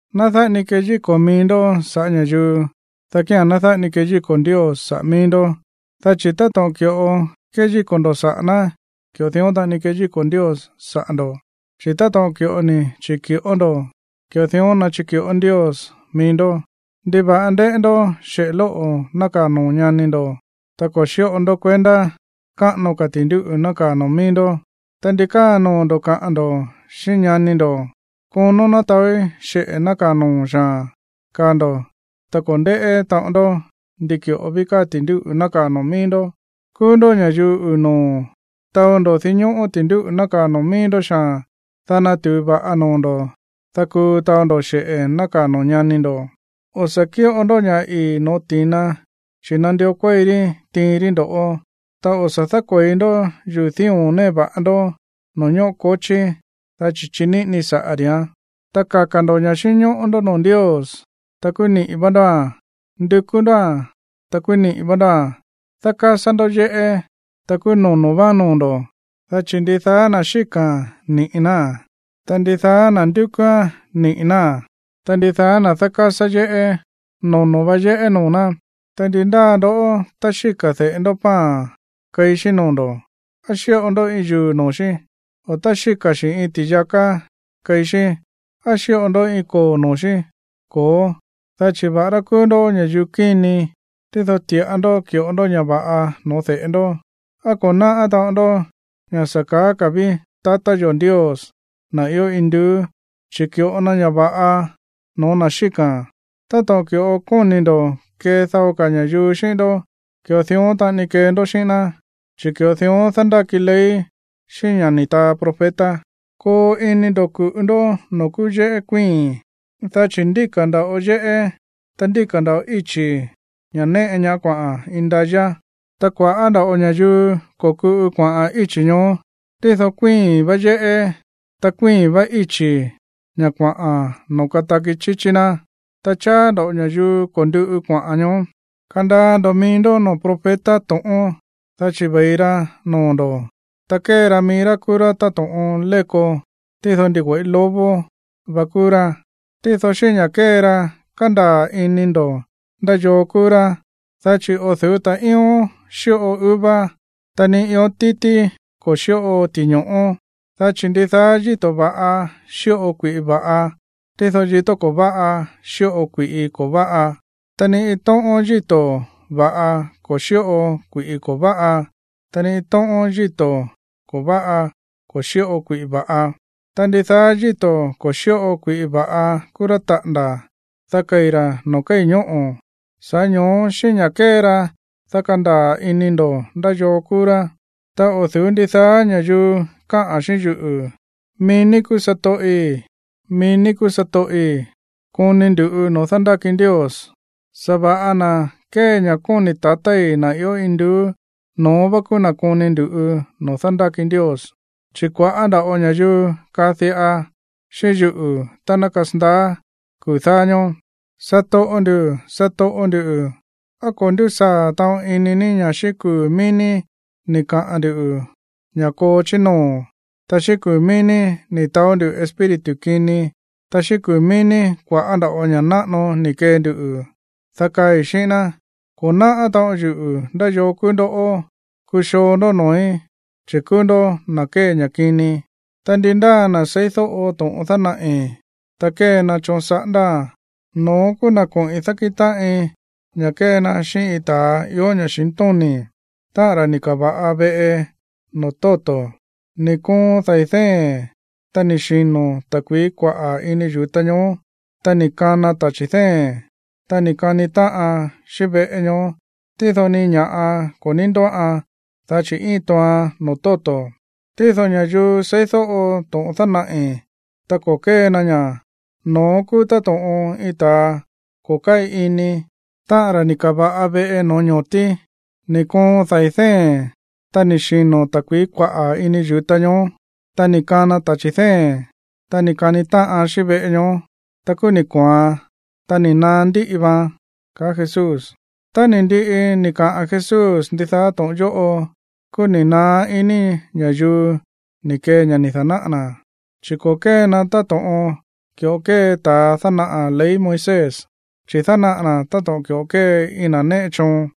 ’Ná dáꞌa ni keyíko̱ mií ndó sa̱ꞌá ña̱yuu, dá kía̱n ná dáꞌa ni keyíko̱ Ndios saꞌa̱ mií ndó. Dá chi̱ táto̱ꞌon ki̱ꞌo kéyíko̱ ndo̱ saꞌa̱ ná, ki̱ꞌo dión taꞌani keyíko̱ Ndios saꞌa̱ ndo̱, chi̱ táto̱ꞌon ki̱ꞌo chíki̱ꞌó ndo̱, ki̱ꞌo dión ná chiki̱ꞌó Ndios mií ndó. ¿Ndiva̱ꞌa ndéꞌé ndó xeꞌe̱ lóꞌo̱ nákaa̱ noo̱ ñani ndo̱, ta ko̱ xíꞌo ndó kuendá káꞌano ka̱ ti̱ndúꞌu̱ nákaa̱ noo̱ mií ndó? Ta, ¿ndi káa noo̱ ndo̱ kaꞌa̱n ndo̱ xíꞌín ñani ndo̱: “Konón ná taóí xeꞌe̱ nákaa̱ noo̱ xaa̱n”, kaá ndo̱, ta ko̱ ndéꞌé taꞌon ndó ndi ki̱ꞌo ví káa ti̱ndúꞌu̱ nákaa̱ noo̱ mií ndó? ¡Kúú ndó ña̱yuu uu̱ noo̱! Taó ndó dinñóꞌó ti̱ndúꞌu̱ nákaa̱ noo̱ mií ndó xaa̱n, dá natu̱u va̱ꞌa noo̱ ndo̱, dá kuu taó ndó xe̱ꞌe nákaa̱ noo̱ ñani ndo̱. ’O̱ sa̱ kíꞌo ndó ña̱ ii̱ no̱ó ti̱na, chi̱ nandió kuéi rí tiin rí ndo̱ꞌó. Ta o̱ sa̱ dákue̱i ndó yuu̱ dío̱n néꞌe va̱ꞌa ndó noo̱ ñóꞌo kochí, dá chi̱ chiníꞌini saꞌa̱ ri̱án. ’Ta kaka̱ ndo̱ ña̱ xínñóꞌó ndó noo̱ Ndios, ta kúú niꞌi̱ vá ndóa̱n. Ndukú ndóa̱n, ta kúú niꞌi̱ vá ndóa̱n. Dákásá ndó yéꞌé, ta kúú nonó váán noo̱ ndo̱. Dá chi̱ ndidaá na̱ xíka̱a̱n, niꞌi̱ náa̱n, ta ndi ndáa na̱ nándukú ñá, niꞌi̱ náa̱n. Ta ndi ndáa na̱ dákásá yéꞌé, nonó vá yéꞌé noo̱ ná. ’Ta, ¿ndi ndáa ndoꞌó, tá xíka̱ de̱ꞌe ndó pan keí xí noo̱ ndo̱, á xíꞌo ndó iin yuu̱ noo̱ xí? O, tá xíka̱ xi̱ iin ti̱yaká keí xí, ¿á xíꞌo ndó iin koo̱ noo̱ xí? Ko̱ó, dá chi̱ va̱ꞌará kúú ndó ña̱yuu kíni, tído ti̱ꞌa ndó ki̱ꞌo ndó ña̱ va̱ꞌa no̱ó de̱ꞌe ndó. ¿Á ko̱ náꞌá taꞌon ndó ña̱ sa̱ kaá ka̱ ví tatá yo̱ Ndios, na̱ ió induú, chi̱ ki̱ꞌo na ña̱ va̱ꞌa no̱ó na̱ xíka̱a̱n? Táto̱ꞌon ki̱ꞌo kóni̱ ndo̱ kee dao ka̱ ña̱yuu xíꞌín ndó, ki̱ꞌo dión taꞌani kee ndó xíꞌín ná, chi̱ ki̱ꞌo dión dándáki ley xíꞌín ña̱ ni̱ taa profeta. ’Koo ini ndo̱ ku̱ꞌu ndó noo̱ kúú yéꞌé kuíi̱n, dá chi̱ ndíka̱ nda̱ꞌo yéꞌé, ta ndíka̱ nda̱ꞌo íchi̱, ña̱ néꞌe ñaá kuaꞌa̱n indayá. Ta kua̱ꞌá nda̱ꞌo ña̱yuu ko̱kuꞌu kuaꞌa̱n íchi̱ ñoó. Tído kuíi̱n vá yéꞌé, ta kuíi̱n vá íchi̱, ña̱ kuaꞌa̱n noo̱ kataki chíchí ná, ta cháá nda̱ꞌo ña̱yuu ko̱nduꞌu kuaꞌa̱n ño̱ó. ’Kandaa ndo̱ mií ndó noo̱ profeta to̱ꞌón, dá chi̱ ve̱i ra noo̱ ndo̱, ta kée ra mií rá kúú rá táto̱ꞌon léko, tído ndigüe̱ꞌí lobo va kúú rá. Tído xíꞌín ña̱ kée ra, kandaa̱ ini ndo̱ ndá yoo kúú rá, dá chi̱ o̱ du̱ú ta̱ꞌíón xíꞌo uva, ta ni ión títí ko̱ xíꞌo ti̱ño̱ꞌó. Dá chi̱ ndidaá yíto̱ va̱ꞌa xíꞌo kui̱ꞌi va̱ꞌa, tído yíto̱ ko̱ váꞌa xíꞌo kui̱ꞌi ko̱ váꞌa. Ta ni iin tóꞌón yíto̱ va̱ꞌa ko̱ xíꞌo kui̱ꞌi ko̱ váꞌa, ta ni iin tóꞌón yíto̱ ko̱ váꞌa ko̱ xíꞌo kui̱ꞌi va̱ꞌa. Ta ndidaá yíto̱ ko̱ xíꞌo kui̱ꞌi va̱ꞌa kúú rá taꞌa̱nda̱, dá kei̱ ra̱ noo̱ kéi̱ ñóꞌo̱. Sa̱ꞌá ño̱ó, xíꞌín ña̱ kée ra, dá kandaa̱ ini ndo̱ ndá yoo kúú rá. ’Ta o̱ du̱ú ndidaá ña̱yuu káꞌa̱n xíꞌín yuꞌu̱: “¡Mií ní kúú satoꞌi̱, mií ní kúú satoꞌi̱!”, koni ndu̱ꞌu noo̱ dándáki Ndios. Sa̱va̱ꞌa na̱ kée ña̱ kóni̱ tatái̱, na̱ ió induú, no̱ón vá kúú na̱ koni ndu̱ꞌu noo̱ dándáki Ndios. Chi̱ kua̱ꞌá nda̱ꞌo ña̱yuu kaa diꞌa xíꞌín yuꞌu̱ tá ná kasandaá kuu̱ dáá ñóó: “Satoꞌo nduꞌu̱, satoꞌo nduꞌu̱, ¿á ko̱ ndúsaa̱ taꞌon ini ní ña̱ xíꞌín kuu̱ mií ní ni̱ kaꞌa̱n ndu̱ ña̱ koo chí noo̱, ta xíꞌín kuu̱ mií ní ni̱ taó ndú espíritu kini, ta xíꞌín kuu̱ mií ní kua̱ꞌá nda̱ꞌo ña̱ náꞌano ni̱ kee nduꞌu̱?” Dá kaai̱ xíꞌín ná: “Ko̱ náꞌá taꞌon yuꞌu̱ ndá yoo kúú ndó. Kuxoo ndó noo̱í, chi̱ kúú ndó na̱ kée ña̱ kini.” ’Ta ndi ndáa na̱ seídóꞌo to̱ꞌon dánaꞌi̱, ta kée na choon saꞌándáa̱n, no̱ón kúú na̱ koꞌi̱n dákíꞌin táꞌin ña̱ kée na xíꞌín iin ta̱a ió ña̱xintóni̱, táꞌa̱n ra̱ ni̱ ka̱va̱ꞌa veꞌe noo̱ tóto̱. Ni̱ koon dai̱ dée̱n, ta ni̱ xino̱ ta̱kui̱í kuaꞌa̱ ini yu̱ta ñoó, ta ni̱ kana tachi̱ dée̱n, ta ni̱ kani táꞌan xíꞌín veꞌe ñoó, tído ni iin ña̱ꞌa ko̱ ní ndóꞌan, dá chi̱ íin tooan noo̱ tóto̱. Tído ña̱yuu seídóꞌo to̱ꞌon dánaꞌi̱, ta ko̱ kée na ña̱, no̱ón kúú táto̱ꞌon iin ta̱a ko̱ káꞌi ini, táꞌa̱n ra̱ ni̱ ka̱va̱ꞌa veꞌe noo̱ ño̱tí. Ni̱ koon dai̱ dée̱n, ta ni̱ xino̱ ta̱kui̱í kuaꞌa̱ ini yu̱ta ñoó, ta ni̱ kana tachi̱ dée̱n, ta ni̱ kani táꞌan xíꞌín veꞌe ñoó, ta kúú ni̱ kooan, ta ni̱ naá ndíꞌi vaan ―kaá Jesús. Ta ni̱ ndiꞌi ni̱ kaꞌa̱n Jesús ndidaá to̱ꞌon yóꞌo, kúú ni̱ naá iní ña̱yuu ni̱ kee ña̱ ni̱ da̱náꞌa̱ na̱, chi̱ ko̱ kée na̱ táto̱ꞌon ki̱ꞌo kée ta̱ dánaꞌa̱ ley Moisés, chi̱ dánaꞌa̱ na̱ táto̱ꞌon ki̱ꞌo kée iin na̱ néꞌe choon.